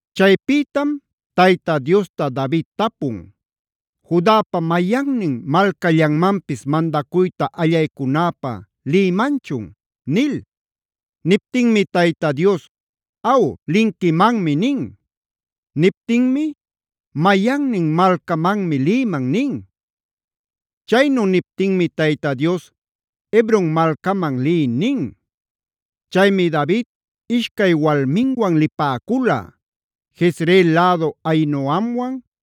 Chaypïtam Tayta Diosta David tapun: “¿Judapa mayannin malcallanmanpis mandacuyta allaycunäpä lïmanchun?” nil. Niptinmi Tayta Dios: “Aw, linquimanmi” nin. Niptinmi: “Mayannin malcamanmi lïman” nin. Chaynu niptinmi Tayta Dios: “Hebron malcaman liy” nin. Chaymi David ishcay walminwan lipäcula: Jezreel lädu Ahinoamwan,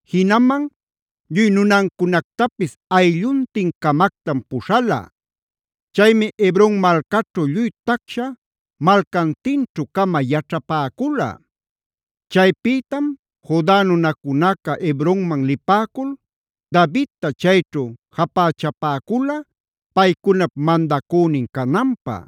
Jinaman lluy nunancunactapis aylluntin-camactam puśhala. Chaymi Hebron malcaćhu lluy tacsha malcantinćhu-cama yaćhapäcula. Chaypïtam Juda nunacunaca Hebronman lipäcul Davidta chayćhu japächapäcula paycunap mandacünin cananpä.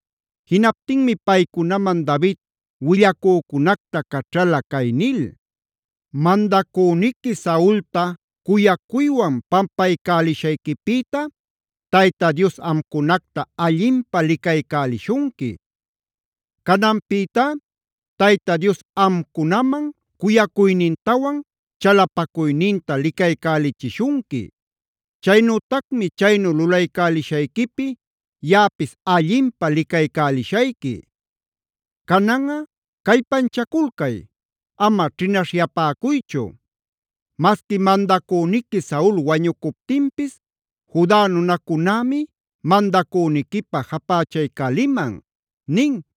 Jinaptinmi paycunaman David willacücunacta caćhala cay nil: “Mandacüniqui Saulta cuyacuywan pampaycälishayquipïta Tayta Dios amcunacta allinpä licaycälishunqui. Cananpïtá Tayta Dios amcunaman cuyacuynintawan chalapacuyninta licaycälichishunqui. Chaynütacmi chaynu lulaycälishayquipi yaꞌapis allinpä licaycälishayqui. Cananꞌa callpanchaculcay, ama ćhinaśhyapäcuychu. Masqui mandacüniqui Saul wañucuptinpis Juda nunacunämi mandacüniquipä japächaycäliman” nin.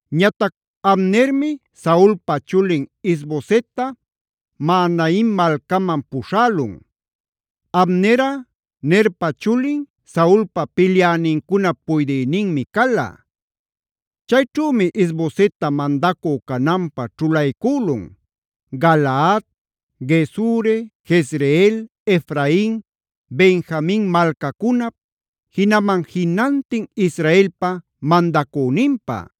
Ñatac Abnermi Saulpa chulin Is-bosetta Mahanaim malcaman puśhälun. Abnerꞌa Nerpa chulin, Saulpa pilyänincunap puydïninmi cala. Chayćhümi Is-bosetta mandacü cananpä ćhulaycülun: Galaad, Gesuri, Jezreel, Efrain, Benjamin malcacunap, jinaman jinantin Israelpa mandacüninpä.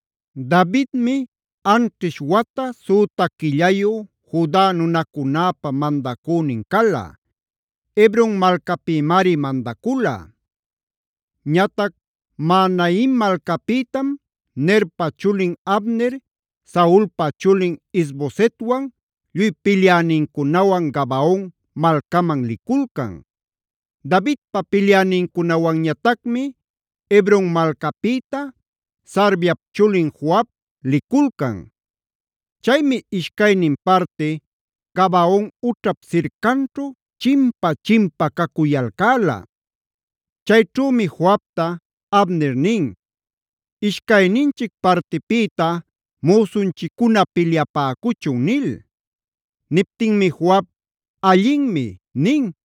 Davidmi anćhish wata süta quillayu Juda nunacunäpä mandacünin cala; Hebron malcapïmari mandacula. Ñatac Mahanaim malcapïtam Nerpa chulin Abner, Saulpa chulin Is-bosetwan lluy pilyänincunawan Gabaon malcaman liculcan. Davidpa pilyänincunawanñatacmi Hebron malcapïta Sarviap chulin Joab liculcan. Chaymi ishcaynin parti Gabaon ućhap sircanćhu chimpa-chimpa cacuyalcäla. Chayćhümi Joabta Abner nin: “Ishcayninchic partipïta müsunchiccuna pilyapäcuchun” nil. Niptinmi Joab: “Allinmi” nin.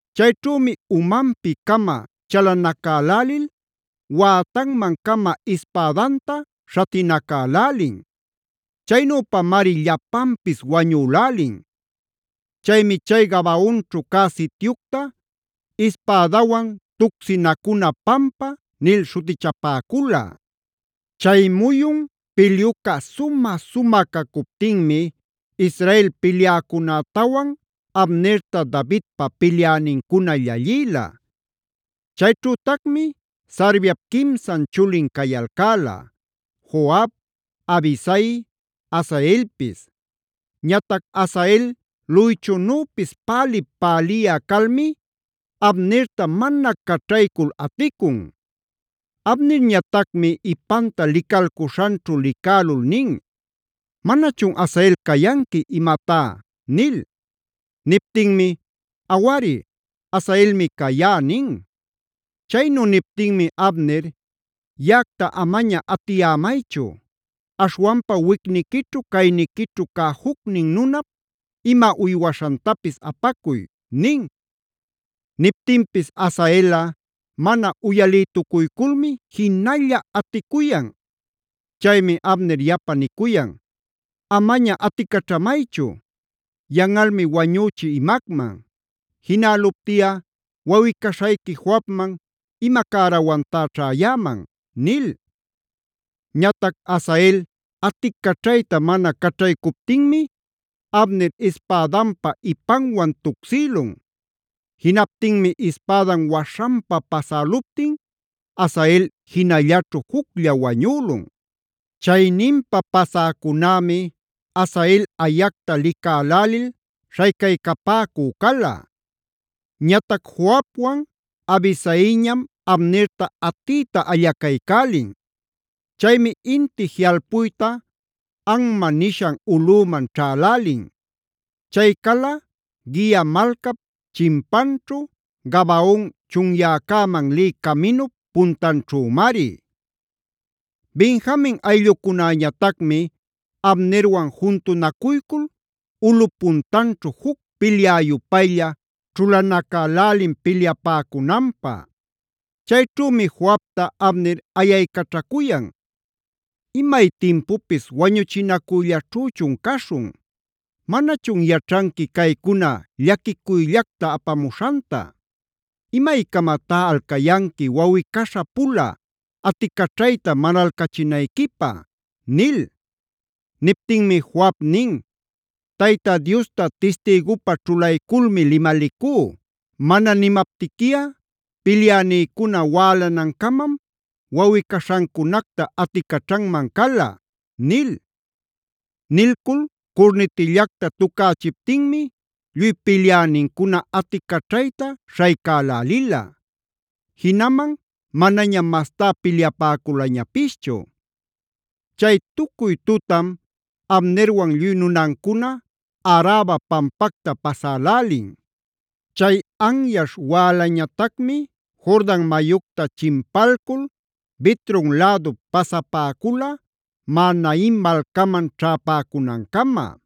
Chayćhümi umanpi-cama chalanacälälil wätanman-cama ispädanta śhatinacälälin. Chaynüpamari llapanpis wañülälin. Chaymi chay Gabaonćhu cä sityucta Ispädawan Tucsinacuna Pampac nil śhutichapäcula. Chay muyun pilyuca sumä-sumä cacuptinmi Israel pilyäcunätawan Abnerta Davidpa pilyänincuna llallïla. Chayćhütacmi Sarviap quimsan chulin cayalcäla: Joab, Abisai, Asaelpis. Ñatac Asael luychunüpis pälip-päliyä calmi, Abnerta mana caćhaycul aticun. Abnerñatacmi ipanta licalcuśhanćhu licälul nin: “¿¡Manachun Asael cayanqui imatá!?” nil. Niptinmi: “¡Awari, Asaelmi cayá!” nin. Chaynu niptinmi Abner: “Yaꞌacta amaña atiyämaychu. Aśhwanpa wicniquićhu, cayniquićhu cä jucnin nunap, ima uywaśhantapis apacuy” nin. Niptinpis Asaelꞌa mana uyalïtucuyculmi jinalla aticuyan. Chaymi Abner yapa nicuyan: “¡Amaña aticaćhamaychu! Yanꞌalmi wañüchï imacman. Jinäluptiꞌa ¿wawꞌi-caśhayqui Joabman ima cärawantá ćhäyäman?” nil. Ñatac Asael aticaćhayta mana caćhaycuptinmi Abner ispädanpa ipanwan tucsïlun. Jinaptinmi ispädan waśhanpa pasäluptin Asael jinallaćhu juclla wañülun. Chayninpa pasäcunämi Asael ayacta licälälil śhaycaycapäcü cala. Ñatac Joabwan Abisaiñam Abnerta atiyta allacaycälin. Chaymi inti jiꞌalpuyta Amma nishan ulꞌüman ćhälälin. Chay cala Gia malcap chimpanćhu, Gabaon chunyäcäman lï caminup patanćhümari. Benjamin ayllucunäñatacmi Abnerwan juntunacuycul ulꞌup puntanćhu juc pilyä-yupaylla ćhulanacälälin pilyapäcunanpä. Chayćhümi Joabta Abner ayaycaćhacuyan: “¿Imay timpupis wañuchinacuyllaćhüchun caśhun? ¿Manachun yaćhanqui caycuna llaquicuyllacta apamuśhanta? ¿Imaycamatá alcayanqui wawꞌi-caśha-pula aticaćhayta manalcachinayquipä?” nil. Niptinmi Joab nin: “Tayta Diosta tistïgupä ćhulayculmi limalicú, mana nimaptiquiꞌa pilyänïcuna wälanancamam wawꞌi-caśhancunacta aticaćhanman cala” nil. Nilcul curnitillacta tucächiptinmi lluy pilyänincuna aticaćhayta śhaycälälila; jinaman manañam mastá pilyapäculañapischu. Chay tucuy tutam Abnerwan lluy nunancuna Araba pampacta pasälälin. Chay anyaśh wälañatacmi Jordan mayucta chimpalcul Bitron lädup pasapäcula Mahanaim malcaman ćhäpäcunancama.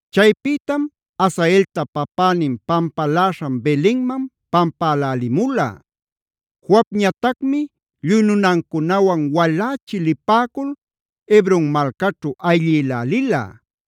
Chaypïtam Asaelta papänin pampaläśhan Belenman pampälälimula. Joabñatacmi lluy nunancunawan walächi lipäcul Hebron malcaćhu ayllïlälila.